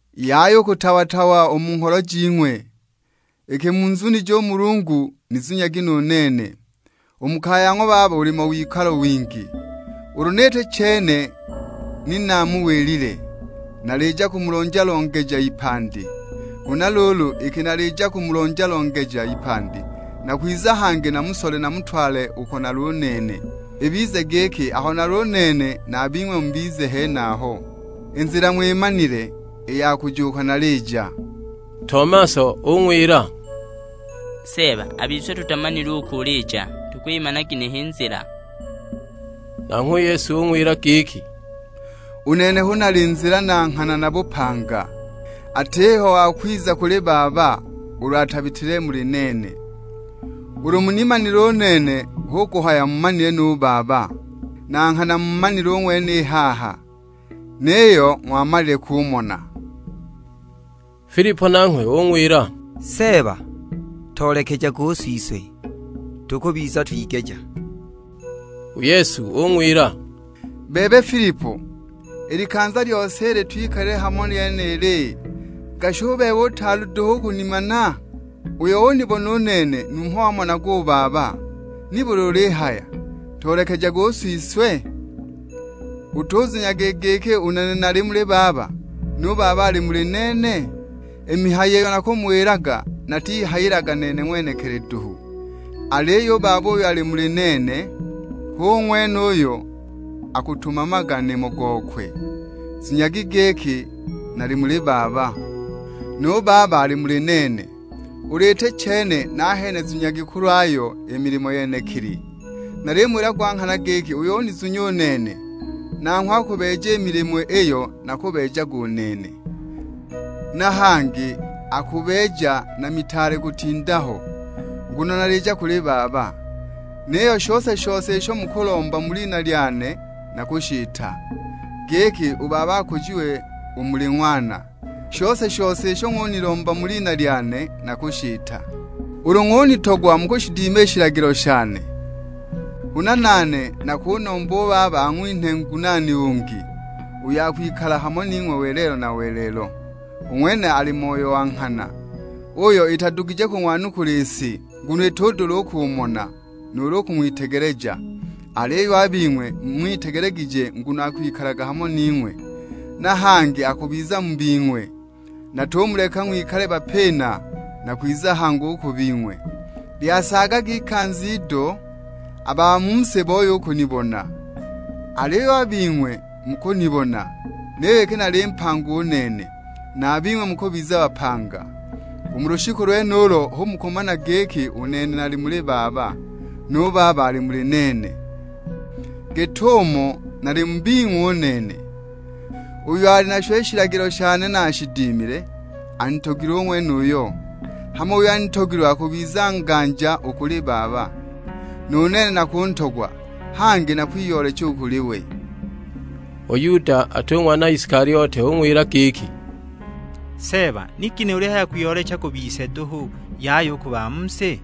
"Yaya u kutawa-tawa u mu ngholo jing'we; iki munzunije u Mulungu nizunyagi nu nene. U mu kaya ya ng'wa Baba bulimo wikalo wingi; ulu ni iti chene ni naamuwilile. Nalija kumulonja-longeja ipandi! Huna luulu iki nalija kumulonja-longeja ipandi, nakwiza hangi namusole namutwale uko nali u nene, ibize giki aho nali u nene na a bing'we mubize henaho. I nzila ng'wimanile, i ya kuja uko nalija." Tomaso ung'wila, "Seeba a bise tutamanile uko ulija, tukwimana ginehe i nzila?" Nanghwe u Yesu ung'wila giki, "U nene hu nali Nzila na Nghana na Bupanga; atiho wa kwiza kuli Baba ulu atabitile muli nene. Ulu munimanile u nene hu kuhaya muumanile nu Baba; na nghana muumanile u ng'wene i haha, niyo ng'wamalile kumona!" Filipo nanghwe ung'wila, "Seeba, toolekejage u Siswe, tukubiza twigeja." U Yesu ung'wila, "Bebe Filipo, i likanza i lyose ili twikalile hamo lyenili, gashi u bebe utaali duhu u kunimana? Uyo unibona u nene numho wamonaga u Baba; nibuli ulihaya, 'Toolekejage u Siswe?' Utuzunyaga i giki u nene nali muli Baba, nu Baba ali muli nene? I mihayo iyo nakumuwilaga natihayilaga nene ng'wenekili duhu, aliyo u Baba uyo ali muli nene hu ng'wene uyo akutumamaga nimo gokwe. Zunyagi giki nali muli Baba, nu Baba ali muli nene; ulu iti chene nahene zunyagi kulwayo i milimo yenekili. Nalimuwila gwa nghana giki uyo unizunya u nene, nanghwe akubeeja i milimo iyo nakubeejaga u nene; na hangi akubeeja na mitaale kutinda ho, nguno nalija kuli Baba. Niyo shose-shose isho mukulomba mu lina lyane nakushita, giki u Baba akujiwe u muli Ng'wana. Shose-shose isho ng'unilomba mu lina lyane nakushita." "Ulu ng'unitogwa mukushidima i shilagilo shane. Huna nane nakunomba u Baba ang'winhe Ngunaani ungi, uyo akwikala hamo ning'we welelo na welelo. U ng'wene ali Moyo wa nghana; uyo itadugije kung'wanukula i si; nguno itudula u kumona, nuulu u kung'witegeleja. Aliyo a bing'we mung'witegelegije nguno akwikalaga hamo ning'we, na hangi akubiza mu bing'we. Natumuleka ng'wikale bapina, nakwiza hangi u ku bing'we. Lyasaagaga ikanza ido, a ba mu si booye u kunibona. Aliyo a bing'we mukunibona, niyo iki nali mpanga u nene, na a bing'we mukubiza bapanga. U mu lushiku lwenulo hu mukumana giki u nene nali muli Baba, nu Baba ali muli nene: git'umo nali mu bing'we u nene. Uyo ali nasho i shilagilo shane na ashidimile, anitogilwe u ng'wenuyo; hama uyo anitogilwe akubiza nganja u kuli Baba, nu nene nakuntogwa, hangi nakwiyoolecha u kuli we." U Yuda (ati u ng'wana Isikaliote); ung'wila giki, "Seeba ni ginehe ulihaya kwiyoolecha ku bise duhu, yaya u ku ba mu si?"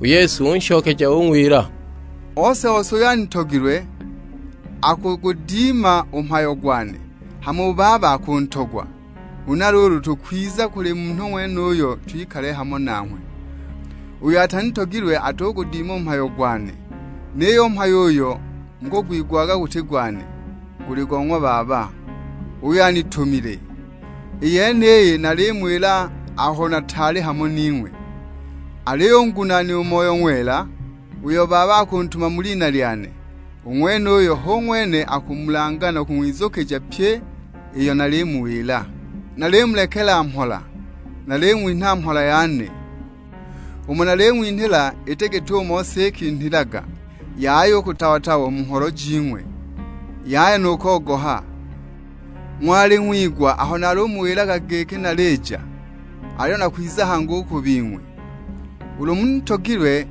U Yesu unshokeja ung'wila, "Ose-ose uyo anitogilwe, akugudima u mhayo gwane; hama u Baba akuntogwa, huna luulu tukwiza u kuli munhu ng'wenuyo twikale hamo nanghwe. Uyo atanitogilwe atugudima u mhayo gwane; niyo u mhayo uyo mukugwigwaga guti gwane, guli go ng'wa Baba, uyo anitumile. I yeniyi nalimuwila aho nataali hamo ning'we. Aliyo u Ngunaani, u Moyo Ng'wela, uyo Baba akuntuma mu lina lyane, u ng'wenuyo hu ng'wene akumulanga na kung'wizukija pyi iyo nalimuwila. Nalimulekela mhola; naling'winha mhola yane. Umo naling'winhila iti git'umo si ikinhilaga. Yaya u kutawa-tawa u mu ngholo jing'we, yaya nu kogoha! Ng'wali ng'wigwa aho nalumuwilaga giki nalija; aliyo nakwiza hangi u ku bing'we. Ulu ni munitogilwe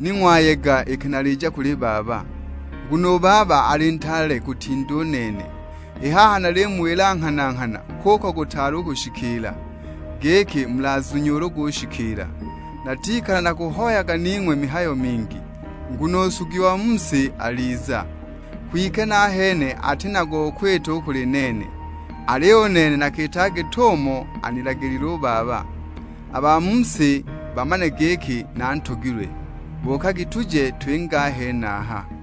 ni ng'wayega iki nalija kuli Baba, nguno u Baba ali ntaale kutinda u nene. I haha nalimuwila nghana-nghana kuko gutaali u kushikiila; giki mulazunye ulu gushikiila. Natikala nakuhoyaga ning'we mihayo mingi, nguno u nsugi wa mu si aliza, kwike nahene ati na go kwita u kuli nene. Aliyo u nene nakiitaga git'umo anilagilile u Baba, a ba mu si bamane giki nantogilwe. Buukagi tuje twinge a henaha!"